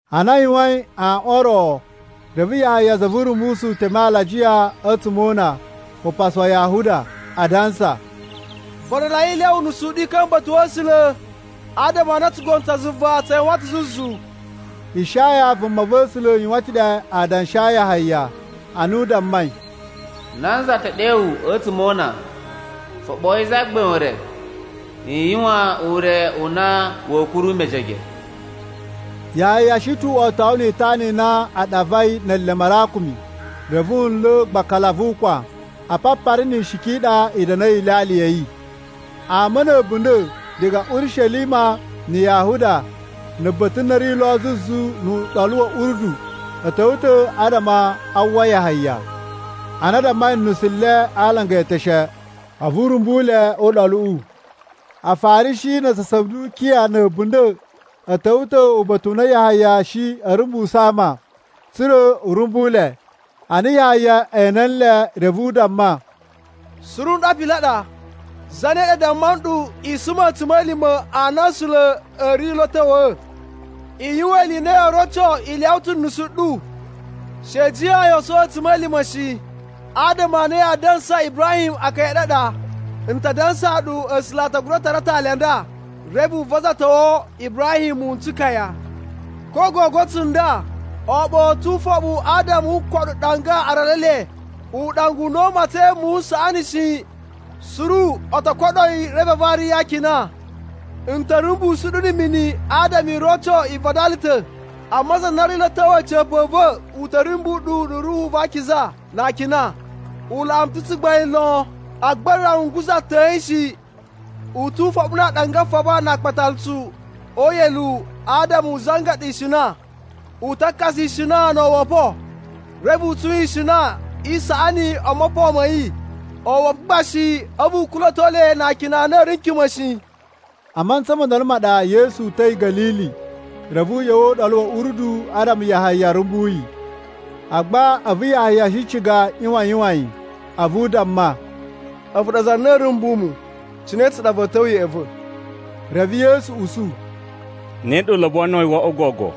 Ana a yuwain aꞌwan o ro, reve Yahaya za vu Urumbusu teme alajiya a̱tsuma̱ o una upasu wa Yahuda, adansa, “Vadalai i lyawa unusu u ɗu i ka̱mba̱ uba̱ta̱ wa̱ A̱sula̱, adama a na tsugono tsa zuva tsa yuwan ta̱ zuzu.” Ishaya vumava̱sula̱ yuwan ta̱ ɗe adanshi a Yahaya ana u dammai: “Nanza te ɗewu a̱tsuma̱ o una, ‘Foɓoyi Zagbain ure, i yuwan ure u na wa̱a̱ kuru mejege!’” Yahaya shi ta̱ wotowu ni itana i na a ɗavai ne eleme a arakumi. Reve wu nla̱ gbakala vu ukwan. Apapari ni ishiki i ɗa i da̱na̱i ilyalya ya̱ yi. Ama na̱ a̱bunda̱ diga Urishelima na̱ Yahuda na̱ ba̱ta̱ na ri lo zuzu nu Uɗolu wa̱ Urdu a̱ ta̱wa̱ ta̱ adama a uwwa Yahaya. Ana a dammai nusu le a alanga e eteshe, a̱vu u rumbu le o uɗoluꞌu. Afarishi na aza a Sadukiya na̱ a̱bunda̱ a̱ ta̱wa̱ ta̱ uba̱ta̱ u na Yahaya shi a̱ rumbusu ama tsa̱ra̱ u rumbu le. Ana Yahaya ene nle, reve u damma, “Suru nɗu apili a ɗa! Zane ɗa damma nɗu i suma a̱tsuma̱lima̱ a na A̱sula̱ a̱ ri lo a̱ ta̱wa̱a̱? I yuwan ili i na yoo roco i lyawa ta̱ nusu ɗu. She i jiyan yoo sowo a̱tsuma̱lima̱ shi, adama a na yaa dansa Ibrahim akaya a̱ ɗu a ɗa. N ta dansaa ɗu A̱sula̱ a ta gura tara atali a nda, reve u vazatowo Ibrahim muwun n tsukaya! Ko gogo tsunda, aaɓau a̱ ta̱ lo ufoɓu adama wu koɗo ɗanga a aralu e le. Uɗanga u na u matsain muwun n saꞌani shi, suru o to koɗo yi reve a vari yi akina. “N ta̱ rumbusu ɗu na̱ mini adama u roco i vadala ta̱, amma za na ri lo a̱ ta̱wa̱ a̱ca̱pa̱ a̱ va̱ u ta̱ rumbu ɗu na̱ Ruhu va Akiza na akina. U laꞌa mu ta̱ tsugbain lon, agba n rawa n guza̱a̱ yi atan shi. U tu ufoɓu na aaɗanga a faba na aakpatalutsu o uyeluwu adama u zangaɗa ishina. U ta kakasa ishina no owopo. Reve u tsun ishina i saꞌani o mopon ma̱ yi, owopo gba shi a̱vu u kula̱to le na akina a na a̱ ri n kima̱ shi.” A mantsa mo ndolo ma ɗa Yesu uta̱i Ga̱lili, reve u ꞌya̱wa̱ o Uɗolu wa̱ Urdu adama Yahaya rumbu yi. Agba a̱vu Yahaya shi ciga u ꞌyuwan a yuwan yi, a̱vu u damma, “A̱vu ɗa za na a̱a̱ rumbu mu. Cine tsa ɗa va̱a̱ ta̱wa̱ ya̱ꞌa̱ va̱?” Reve Yesu usu, “Ne ɗa u lobonoi wo oꞌwo gogo,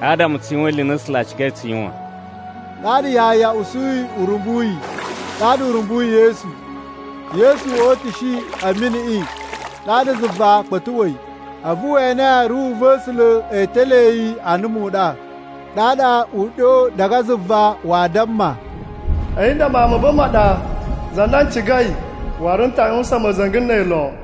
adama tsu yuwan ili i na A̱sula̱ a cigai tsu yuwan.” Ɗaɗa Yahaya usuyi u rumbu yi. Ɗaɗa u rumbuyi Yesu. Yesu o utushi a̱ miniꞌi, ɗaɗa zuva kpa̱tuꞌwa̱i, a̱vu we ene Ruhu va̱ A̱sula̱ e telee yi ana muɗa. Ɗaɗa uɗyo diga zuva wa damma, “A̱yi nda Mawun ma̱ va̱ ma ɗa, za na n cigai, waru n ta yuwusan ma̱za̱nga̱ na̱ a̱yi lon.”